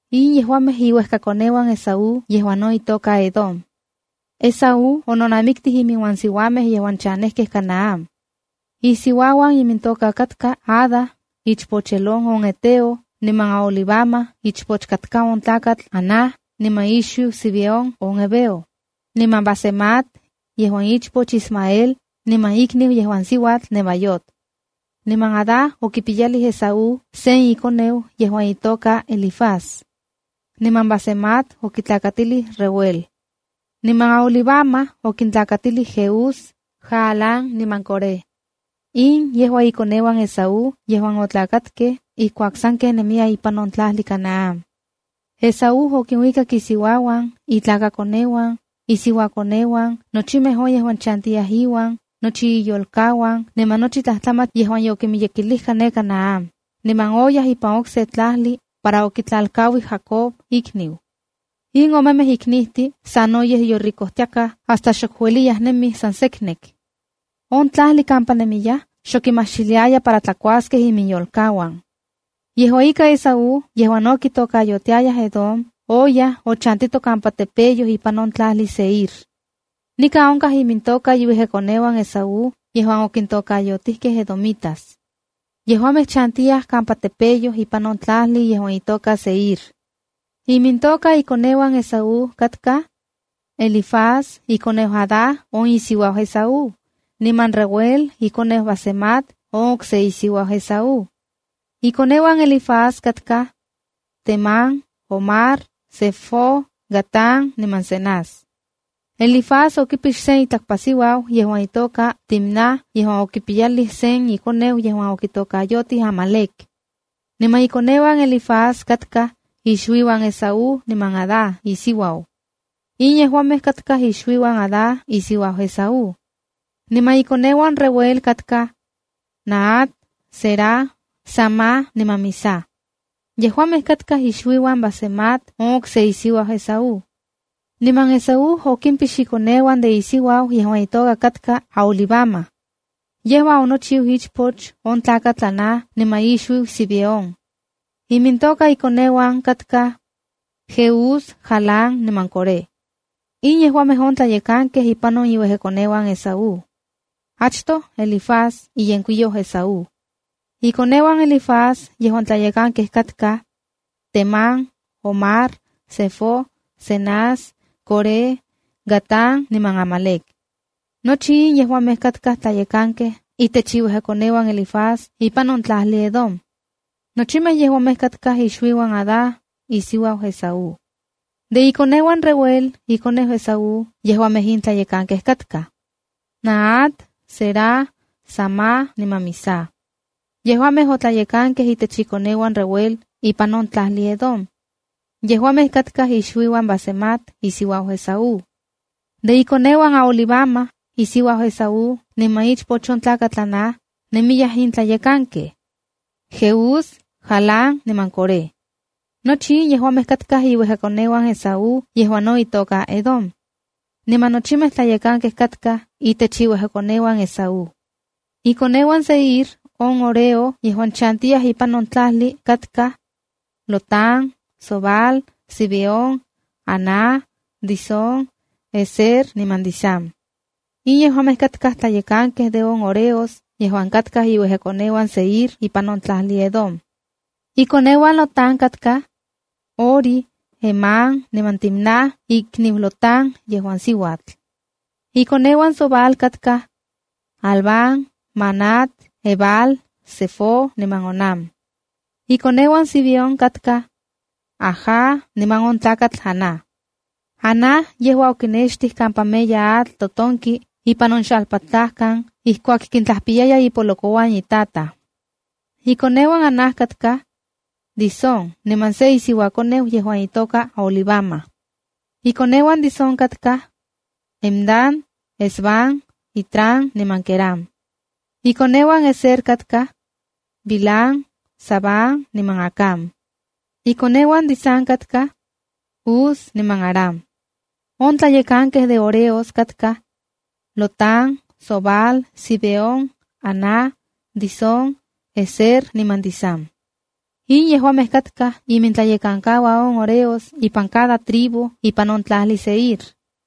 In yejuamej iuejka koneuan Esaú yejuan no itoka Edom. Esaú ononamiktij inmiuan siuamej yejuan chanejkej Canaán. Isiuauan imintoka katka Ada, ichpoch Elón on heteo, niman Aholibama, ichpoch katka on tlakatl Aná niman ixuiu Zibeón on heveo, niman Basemat, yejuan ichpoch Ismael, niman ikniu yejuan siuatl Nebaiot. Niman Ada okipiyalij Esaú sen ikoneu yejuan itoka Elifaz. Niman Basemat okitlakatilij Reuel. Niman Aholibama okintlakatilij Jeús, Jaalam niman Coré. In yejua ikoneuan Esaú yejuan otlakatkej ijkuak sanken nemiyaj ipan on tlajli Canaán. Esaú okinuikak isiuauan, itlakakoneuan, isiuakoneuan, nochimej on yejuan chantiyaj iuan, nochi iyolkauan niman nochi tlajtlamach yejuan yokimiyekilijka ne Canaán, niman oyaj ipan okse tlajli para okitlalkauij Jacob, ikniu. In omemej iknijtin sanoyej yoricojtiakaj hasta xok ueliyaj nemij san seknek. On tlajli kampa nemiyaj xok kimajxiliaya para tlakuaskej iminyolkauan. Yejua ika, Esaú, yejuan no kitokayotiayaj Edom, oyaj ochantito kampa tepeyoj ipan on tlajli Seir. Nikan onkaj imintoka iuejkakoneuan Esaú yejuan okintokayotijkej edomitas. Yejuamej chantiyaj kampa tepeyoj ipan on tlajli yejuan itoka Seir. Imintoka ikoneuan Esaú katkaj: Elifaz ikoneu Adá niman Esaú, niman Reuel, ikoneu Basemat niman Esaú. Ikoneuan Elifaz katkaj: Temán, Omar, Zefo, Gatam niman Senaz. Elifaz okipix sen itlakpasiuau yejuan itoka Timna yejuan okipiyalij sen ikoneu yejuan okitokayotij Amalec. Niman ikoneuan Elifaz katkaj ixuiuan Esaú niman Ada isiuau. In yejuamej katkaj ixuiuan Ada isiuau Esaú. Niman ikoneuan Reuel katkaj: Nahat, Zera, Sama niman Miza. Yejuamej katkaj ixuiuan Basemat on okse isiuau Esaú. Niman Esaú okimpix ikoneuan de isiuau yejuan itoka katka Aholibama. Yejua onochiu ichpoch on tlakatl Aná niman ixuiu Zibeón. Imintoka inkoneuan katkaj: Jeús, Jaalam niman Coré. In yejuamej on tlayekankej ipan iuejkakoneuan Esaú. Achtoj, Elifaz iyenkuiyou Esaú. Ikoneuan Elifaz yejuan tlayekankej katkaj: Temán, Omar, Zefo, Cenaz, Coré, Gatam niman Amalec. Nochi in yejuamej katkaj tlayekankej itech iuejkakoneuan Elifaz ipan on tlajli Edom. Nochimej yejuamej katkaj ixuiuan Ada, isiuau Esaú. De ikoneuan Reuel, ikoneu Esaú, yejuamej in tlayekankej katkaj: Nahat, Zera, Sama niman Miza. Yejuamej otlayekankej itech ikoneuan Reuel ipan on tlajli Edom. Yejuamej katkaj ixuiuan Basemat, isiuau Esaú. De ikoneuan Aholibama, isiuau Esaú, niman ichpoch on tlakatl Aná, nemiyaj in tlayekankej: Jeús, Jaalam niman Coré. Nochi in yejuamej katkaj iuejkakoneuan Esaú yejuan no itoka Edom. Niman nochimej tlayekankej katkaj itech iuejkakoneuan Esaú. Ikoneuan Seir on horeo, yejuan chantiyaj ipan on tlajli katkaj: Lotán, Sobal, Zibeón, Aná, Disón, Ezer niman Disán. In yejuan katkaj tlayekankej de on horeos yejuan katkaj iuejkakoneuan Seir ipan on tlajli Edom. Ikoneuan Lotán katkaj: Hori, Hemam niman Timna ikniu Lotán yejuan siuatl. Ikoneuan Sobal katkaj: Alván, Manahat, Ebal, Sefo niman Onam. Ikoneuan Zibeón katkaj: Aja niman on tlakatl Aná. Aná yejua okinextij kampa meya atl totonki ipan on xalpatlajkan ijkuak kintlajpiyaya ipolokouan itataj. Ikoneuan Aná katkaj: Disón niman se isiuakoneu yejuan itoka Aholibama. Ikoneuan Disón katkaj: Hemdán, Esbán, Itrán niman Querán. Ikoneuan Ezer katkaj: Bilhán, Zaaván niman Acán. Ikoneuan Disán katkaj: Uz niman Arán. On tlayekankej de horeos katkaj: Lotán, Sobal, Zibeón, Aná, Disón, Ezer niman Disán. In yejuamej katkaj imintlayekankauan on horeos ipan cada tribu ipan on tlajli Seir.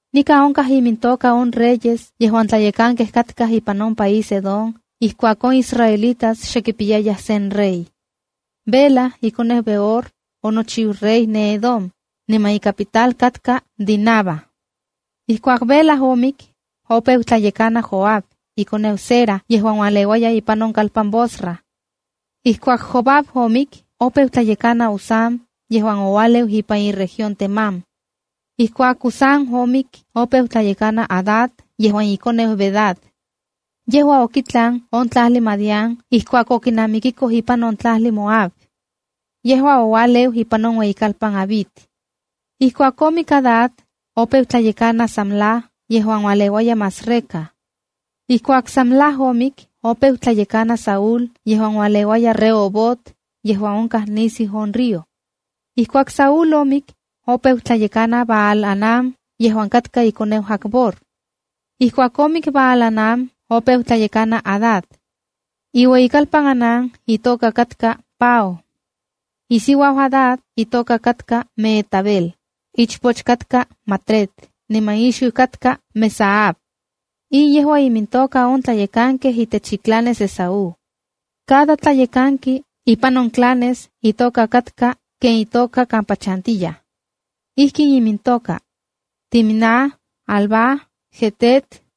Nikan onkaj imintoka on reyes yejuan tlayekankej katkaj ipan on país Edom ijkuak on israelitas xe kipiyayaj sen rey: Bela, ikoneu Beor, onochiu rey ne Edom, niman icapital katka Dinaba. Ijkuak Bela omik, opeu tlayekana Jobab ikoneu Zera yejuan ualeuaya ipan on kalpan Bosra. Ijkuak Jobab omik, opeu tlayekana Usam yejuan oualeu ipan iueyitlalpan Temán. Ijkuak Usam omik, opeu tlayekana Hadad, yejuan ikoneu Bedad. Yejua okitlan on tlajli Madián ijkuak okinamikikoj ipan on tlajli Moab. Yejua oualeu ipan on ueyikalpan Avit. Ijkuak omik Hadad, opeu tlayekana Samla yejuan ualeuaya Masreca. Ijkuak Samla omik, opeu tlayekana Saúl yejuan ualeuaya Rehobot, yejuan onkaj nisiu on río. Ijkuak Saúl omik, opeu tlayekana Baal-hanán yejuan katka ikoneu Acbor. Ijkuak omik Baal-anán, opeu tlayekana Hadad. Iueyikalpan Hanán itoka katka Pau. Isiuau Hadad itoka katka Mehetabel, ichpoch katka Matred niman ixuiu katka Mezaab. In yejua imintoka on tlayekankej itech iclanes Esaú. Cada tlayekanki ipan on clanes itoka katka ken itoka kampa chantiyaj. Ijkin imintoka: Timna, Alva, Jetet,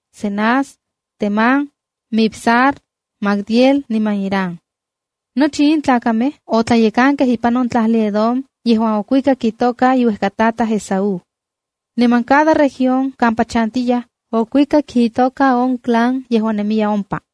Cenaz, Temán, Mibzar, Magdiel niman Iram. Nochi in tlakamej otlayekankej katkaj ipan on tlajli Edom yejuan okuikak itoka inuejkatataj Esaú. Niman cada región kampa chantiyaj okuikak itoka on clan yejuan nemiya ompa.